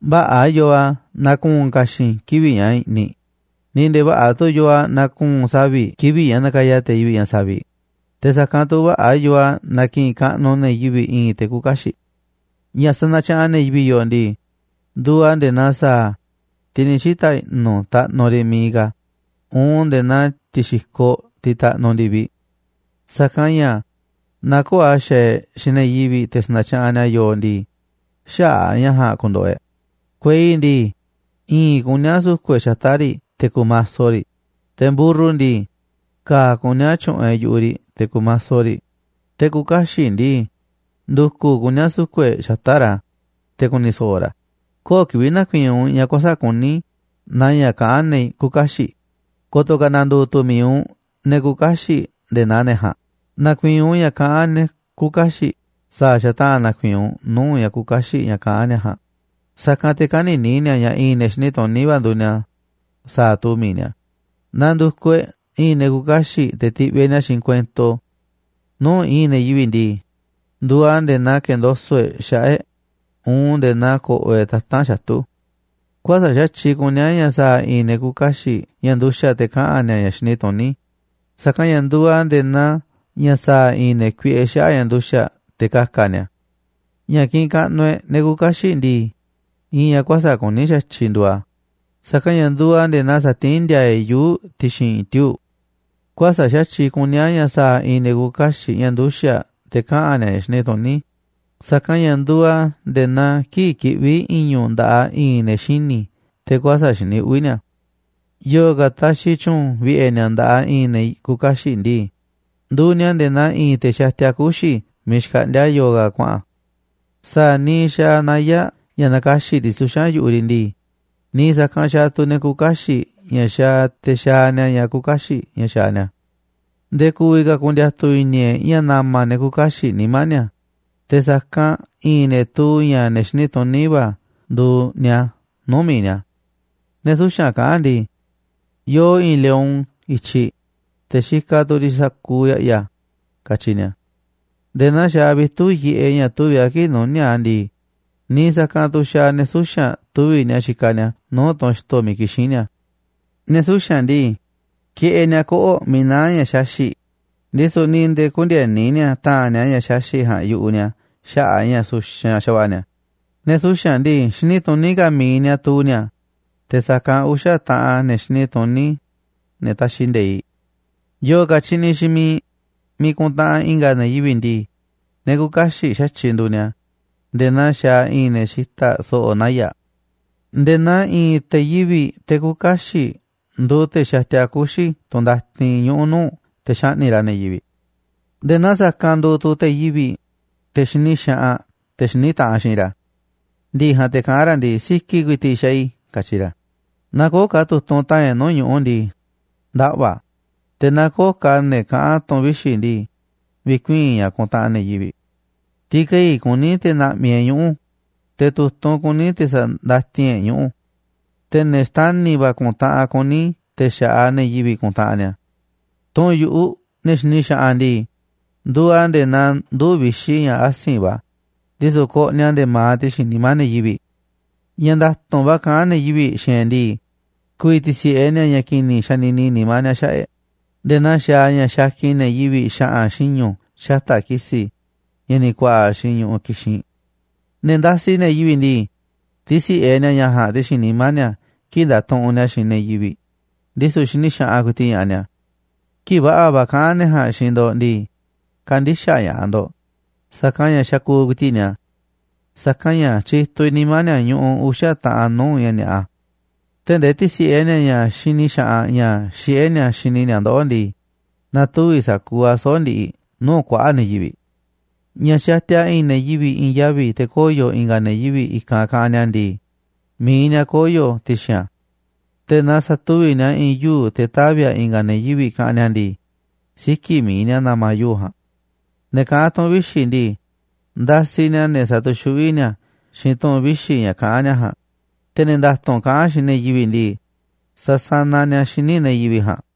Vä̱ꞌa̱ yoo a̱ naaꞌ ku̱u̱n ka̱xi̱n kivi̱ꞌ ña̱ i̱ꞌniꞌ ni̱ nde̱e̱ vä̱ꞌa̱ tu̱ yoo a̱ naaꞌ ku̱u̱n savi̱ꞌ kivi̱ꞌ ña̱ nakaya te̱ yivi̱ꞌ ña̱ saviꞌ, te̱ sa̱kanꞌ tu̱ vä̱ꞌa̱ yoo a̱ naaꞌ ki̱ꞌi̱n kaꞌnuꞌ ne̱ yivi̱ꞌ i̱i̱n te̱ küuꞌ kaxiꞌ. Ña̱ sanatyaꞌanꞌ ne̱ yivi̱ꞌ yooꞌ ndii, nduuꞌ a̱ nde̱e̱ naa sa̱a̱, tiꞌ ni̱ xita̱ i̱ꞌnu̱ taꞌnuꞌ riꞌ miiꞌ ka̱, uun nde̱e̱ naa ti̱xi̱koꞌ tiꞌ taꞌnuꞌ ndi̱viꞌ. Sa̱kanꞌ ña̱ naaꞌ köo̱ꞌ a̱ xaaꞌ e̱ꞌ xiinꞌ ne̱ yivi̱ꞌ te̱ sa̱na̱tyaꞌanꞌ ni̱a̱ yooꞌ ndii, xäa̱ ña̱ ja̱a̱nꞌ ku̱ndo̱ꞌo̱ e̱ꞌ. Kuei ndii, i̱i̱nꞌ kuní a̱ su̱ku̱ꞌ e̱ꞌ xata̱ꞌ riꞌ te̱ ku̱maso riꞌ, te̱ mburru ndii, ka̱a̱ kuní a̱ tyu̱ꞌu̱n e̱ꞌ yu̱ꞌuꞌ riꞌ te̱ ku̱maso riꞌ, te̱ küuꞌ kaxiꞌ ndii, ndu̱ku̱ kuní a̱ su̱ku̱ꞌ e̱ꞌ xata̱ꞌ ra̱, te̱ ku̱ni̱ so̱ꞌo̱ ra̱. Köo̱ꞌ kivi̱ꞌ na̱ku̱i̱i̱n u̱nꞌ ña̱ kuäsa̱ꞌ kuní naa ña̱ kaꞌán ne̱ küuꞌ kaxiꞌ, ko̱to̱ ka̱ na̱ndu̱u̱ tu̱ mi̱iꞌ u̱nꞌ ne̱ küuꞌ kaxiꞌ nde̱e̱ naa ne̱ ja̱a̱nꞌ. Na̱ku̱i̱i̱n u̱nꞌ ña̱ kaꞌán ne̱ küuꞌ kaxiꞌ sa̱a̱ xataꞌa̱n na̱ku̱i̱i̱n u̱nꞌ nuu̱ꞌ ña̱ küuꞌ kaxiꞌ ña̱ kaꞌán ni̱a̱ ja̱a̱nꞌ, sa̱kanꞌ te̱ kä̱ni̱ni̱ ni̱a̱ ña̱ i̱i̱n ne̱ xini tuní va̱ nduuꞌ ni̱a̱, sa̱a̱ tuu mi̱iꞌ ni̱a̱. Naaꞌ ndu̱kuꞌ e̱ꞌ i̱i̱n ne̱ küuꞌ kaxiꞌ te̱ ti̱ꞌviꞌ e̱ꞌ ni̱a̱ xiinꞌ kuento nuu̱ꞌ i̱i̱n ne̱ yivi̱ꞌ ndii, nduuꞌ a̱ nde̱e̱ naa ke̱ndoso̱ꞌ e̱ꞌ xaꞌa̱ꞌ e̱ꞌ uun nde̱e̱ naa ko̱ꞌo̱ e̱ꞌ tata̱nꞌ xatu̱. Kuäsa̱ꞌ xa̱tyiꞌ kuní a̱ ña̱ sa̱a̱ i̱i̱n ne̱ küuꞌ kaxiꞌ ña̱ nduxa̱ꞌ te̱ kaꞌa̱n ni̱a̱ ña̱ xini tuní, sa̱kanꞌ ña̱ nduuꞌ a̱ nde̱e̱ naa ña̱ sa̱a̱ i̱i̱n ne̱ kuiꞌe xaꞌa̱ꞌ ña̱ nduxa̱ꞌ te̱ ka̱ka̱ ni̱a̱. Ña̱ kiꞌinꞌ kaꞌnuꞌ e̱ꞌ ne̱ küuꞌ kaxiꞌ ndii, i̱i̱n ña̱ kuäsa̱ꞌ kuní xa̱tyiꞌ nduuꞌ a̱, sa̱kanꞌ ña̱ nduuꞌ a̱ nde̱e̱ naa sa̱tiín ndi̱a̱a̱ e̱ꞌ yuu̱ꞌ ti̱xi̱n tiuu̱ꞌ. Kuäsa̱ꞌ xa̱tyiꞌ kuní a̱ ña̱ sa̱a̱ i̱i̱n ne̱ küuꞌ kaxiꞌ ña̱ nduxa̱ꞌ te̱ kaꞌa̱n ni̱a̱ ña̱ xini tuní, sa̱kanꞌ ña̱ nduuꞌ a̱ nde̱e̱ naa kii̱ꞌ kiꞌví i̱ñu̱ꞌ nda̱ꞌaꞌ i̱i̱n ne̱ xini̱ te̱ kuäsa̱ꞌ xini uꞌvi̱ ni̱a̱. Yo̱o̱ ka̱ taxiꞌ tyu̱u̱n vi̱ꞌe̱ ni̱a̱ nda̱ꞌaꞌ i̱i̱n ne̱ küuꞌ kaxiꞌ ndii, nduuꞌ ni̱a̱ nde̱e̱ naa i̱i̱n te̱ xatia kuxi̱ miiꞌ xkaꞌndíá yo̱o̱ ka̱ kuaꞌa̱n. Sa̱a̱ niiꞌ xaaꞌ naya̱ꞌ ña̱ nakaxi̱ꞌ riꞌ suxa̱n yu̱ꞌuꞌ riꞌ ndii, niiꞌ sa̱kanꞌ xaaꞌ tu̱ ne̱ küuꞌ kaxiꞌ ña̱ xaaꞌ te̱ xaaꞌ ni̱a̱ ña̱ küuꞌ kaxiꞌ ña̱ xa̱ xaaꞌ ni̱a̱. Nde̱e̱ ku̱vi̱ ka̱ ku̱ndi̱a̱tu̱ i̱ni̱ e̱ꞌ ña̱ na̱ma̱ ne̱ küuꞌ kaxiꞌ nimá ni̱a̱, te̱ sa̱kanꞌ i̱i̱n ne̱ tuu ña̱ ne̱ xiní va̱ nduuꞌ ni̱a̱ nuu̱ꞌ mi̱iꞌ ni̱a̱. Ne̱ suxa̱nꞌ kaꞌán ndii: “Yoo i̱i̱n lion i̱tyiꞌ, te̱ xikaꞌ tu̱ riꞌ sa̱kuuꞌ ya̱ꞌya̱”, katyi ni̱a̱. Nde̱e̱ naa xaaꞌ vitu̱ꞌ yiꞌeꞌ ña̱ tuvi̱ꞌ a̱ kii̱ꞌ nuníáꞌ a̱ ndii, niiꞌ sa̱kanꞌ tu̱ xaaꞌ ne̱ suxa̱nꞌ tuvi̱ꞌ ni̱a̱ xikaꞌ ni̱a̱ nuu̱ꞌ tunꞌ xto̱ miiꞌ kixín ni̱a̱. Ne̱ suxa̱nꞌ ndii, kiꞌeꞌ ni̱a̱ koꞌo̱ꞌ miiꞌ naá ña̱ xaxi̱ꞌ, ndisu̱ ni̱ nde̱e̱ kündieni ni̱a̱ ta̱a̱nꞌ ni̱a̱ ña̱ xaxi̱ꞌ ja̱a̱nꞌ yu̱ꞌuꞌ ni̱a̱ xaꞌa̱ꞌ a̱ ña̱ suxanꞌ xa̱va̱ꞌa̱ ni̱a̱. Ne̱ suxa̱nꞌ ndii, xini tuní ka̱ mi̱iꞌ ni̱a̱ tuu ni̱a̱, te̱ sa̱kanꞌ uxa̱ taꞌan ne̱ xini tuní, ne̱ taxiꞌ nde̱iꞌ. Yo̱o̱ ka̱ tyiꞌniꞌ xiinꞌ miiꞌ miiꞌ kuntaꞌanꞌ i̱nga̱ ne̱ yivi̱ꞌ ndii, ne̱ küuꞌ kaxiꞌ xa̱tyiꞌ nduuꞌ ni̱a̱ nde̱e̱ naa xaaꞌ i̱i̱n ne̱ xita̱ꞌ so̱ꞌo̱ naya̱ꞌ. Nde̱e̱ naa i̱i̱n te̱ yivi̱ꞌ, te̱ küuꞌ kaxiꞌ nduuꞌ, te̱ xatia kuxi̱ tunꞌ ndatin ñuꞌu̱ nuu̱ꞌ, te̱ xaꞌni̱ꞌ ra̱ ne̱ yivi̱ꞌ, nde̱e̱ naa sa̱kanꞌ nduuꞌ tu̱ te̱ yivi̱ꞌ, te̱ xini xaꞌanꞌ te̱ xiní taꞌanꞌ xiinꞌ ra̱. Ndi̱ꞌi̱ ja̱a̱nꞌ te̱ kaꞌán ra̱ ndii: “Si̱ki̱ ku̱i̱ti̱ꞌ xaaꞌ i̱”, katyi ra̱. Naaꞌ köo̱ꞌ ka̱ tu̱tunꞌ ta̱a̱nꞌ e̱ꞌ nuu̱ꞌ ñuꞌu̱ ndii, ndaꞌva̱ a̱, te̱ naaꞌ köo̱ꞌ ka̱ ne̱ kaꞌán tu̱ꞌu̱n vixi̱ ndii, vi̱kuii̱n ña̱ kuntaꞌanꞌ ne̱ yivi̱ꞌ. Ti̱kei̱ kuní te̱ na̱ꞌmi̱ e̱ꞌ ñuꞌu̱, te̱ tu̱tunꞌ kuní te̱ sa̱ndatin e̱ꞌ ñuꞌu̱. Te̱ ne̱ xtani̱ va̱ ku̱ntaꞌanꞌ kuní te̱ xa̱ꞌaꞌ ne̱ yivi̱ꞌ ku̱ntaꞌanꞌ ni̱a̱. Tu̱ꞌu̱n yu̱ꞌuꞌ ne̱ xini xaꞌanꞌ ndii, nduuꞌ a̱ nde̱e̱ naa nduu̱ꞌ vixi̱ ña̱ asi̱nꞌ va̱, ndisu̱ koꞌniꞌ a̱ nde̱e̱ ma̱aꞌ ti̱xi̱n nimá ne̱ yivi̱ꞌ. Ña̱ nda̱tu̱nꞌ va̱ kaꞌán ne̱ yivi̱ꞌ xiinꞌ e̱ꞌ ndii, ku̱vi̱ ti̱si̱ꞌe ni̱a̱ ña̱ ki̱ni̱ ña̱ xanini nimá ni̱a̱ xaꞌa̱ꞌ e̱ꞌ, nde̱e̱ naa xaaꞌ ña̱ xakin ne̱ yivi̱ꞌ xa̱ꞌa̱n xiñu̱ xata̱ꞌ ki̱si̱ ña̱ ni̱ ku̱a̱ꞌa̱ xiinꞌ ñu̱ꞌuꞌ kixinꞌ. Ne̱ ndasiꞌ ne̱ yivi̱ꞌ ndii, tisi̱ꞌe ni̱a̱ ña̱ ja̱a̱nꞌ ti̱xi̱n nimá ni̱a̱ kii̱ꞌ ndatuꞌunꞌ ni̱a̱ xiinꞌ ne̱ yivi̱ꞌ, ndisu̱ xini xaꞌanꞌ ku̱i̱ti̱ꞌ ña̱ꞌaꞌ ni̱a̱. Kii̱ꞌ va̱ꞌa̱ va̱ kaꞌán ne jaa̱nꞌ xiinꞌ ndo̱ꞌ ndii, kä̱ndi̱xaꞌ ña̱ꞌaꞌ ndo̱ꞌ, sa̱kanꞌ ña̱ xakuuꞌ ku̱i̱ti̱ꞌ ni̱a̱. Sa̱kanꞌ ña̱ tyituꞌ vi̱ꞌ nimá ni̱a̱ ñuꞌuꞌ uxa̱ taꞌanꞌ nuu̱ꞌ ña̱ ni̱a̱ꞌa. Tee̱ꞌ ndee ti̱si̱ꞌe ni̱a̱ xiinꞌ ña̱ xini xaꞌanꞌ ña̱ xiꞌé ni̱a̱ xini ni̱a̱ ndoꞌó ndii, na̱tuvi̱ sa̱kuuꞌ a̱ soꞌo̱ꞌ ndiꞌiꞌ nuu̱ꞌ kuaꞌa̱ꞌ ne̱ yivi̱ꞌ. Naaꞌ xatiaꞌ i̱i̱n ne̱ yivi̱ꞌ i̱i̱n yavi̱ te̱ koyo̱ i̱nga̱ ne̱ yivi̱ꞌ i̱kanꞌ kaꞌanꞌ ni̱a̱ ndii, mi̱iꞌ ni̱a̱ koyo̱ ti̱xi̱n a̱. Te̱ naaꞌ sa̱tuvi̱ꞌ ni̱a̱ i̱i̱n yuu̱ꞌ te̱ tavi̱ a̱ i̱nga̱ ne̱ yivi̱ꞌ kaꞌanꞌ ni̱a̱ ndii, siki̱ꞌ mi̱iꞌ ni̱a̱ na̱ma̱ yuu̱ꞌ ja̱a̱nꞌ. Ne̱ kaꞌán tu̱ꞌu̱n vixi̱ ndii, ndasiꞌ ni̱a̱ ne̱ satuxuꞌví ni̱a̱ xiinꞌ tu̱ꞌu̱n vixi̱ ña̱ kaꞌán ni̱a̱ ja̱a̱nꞌ, te̱ ne̱ nda̱tu̱nꞌ kaꞌán xiinꞌ ne̱ yivi̱ꞌ ndii, sasanaꞌ ni̱a̱ xíniꞌ ne̱ yivi̱ꞌ ja̱a̱nꞌ.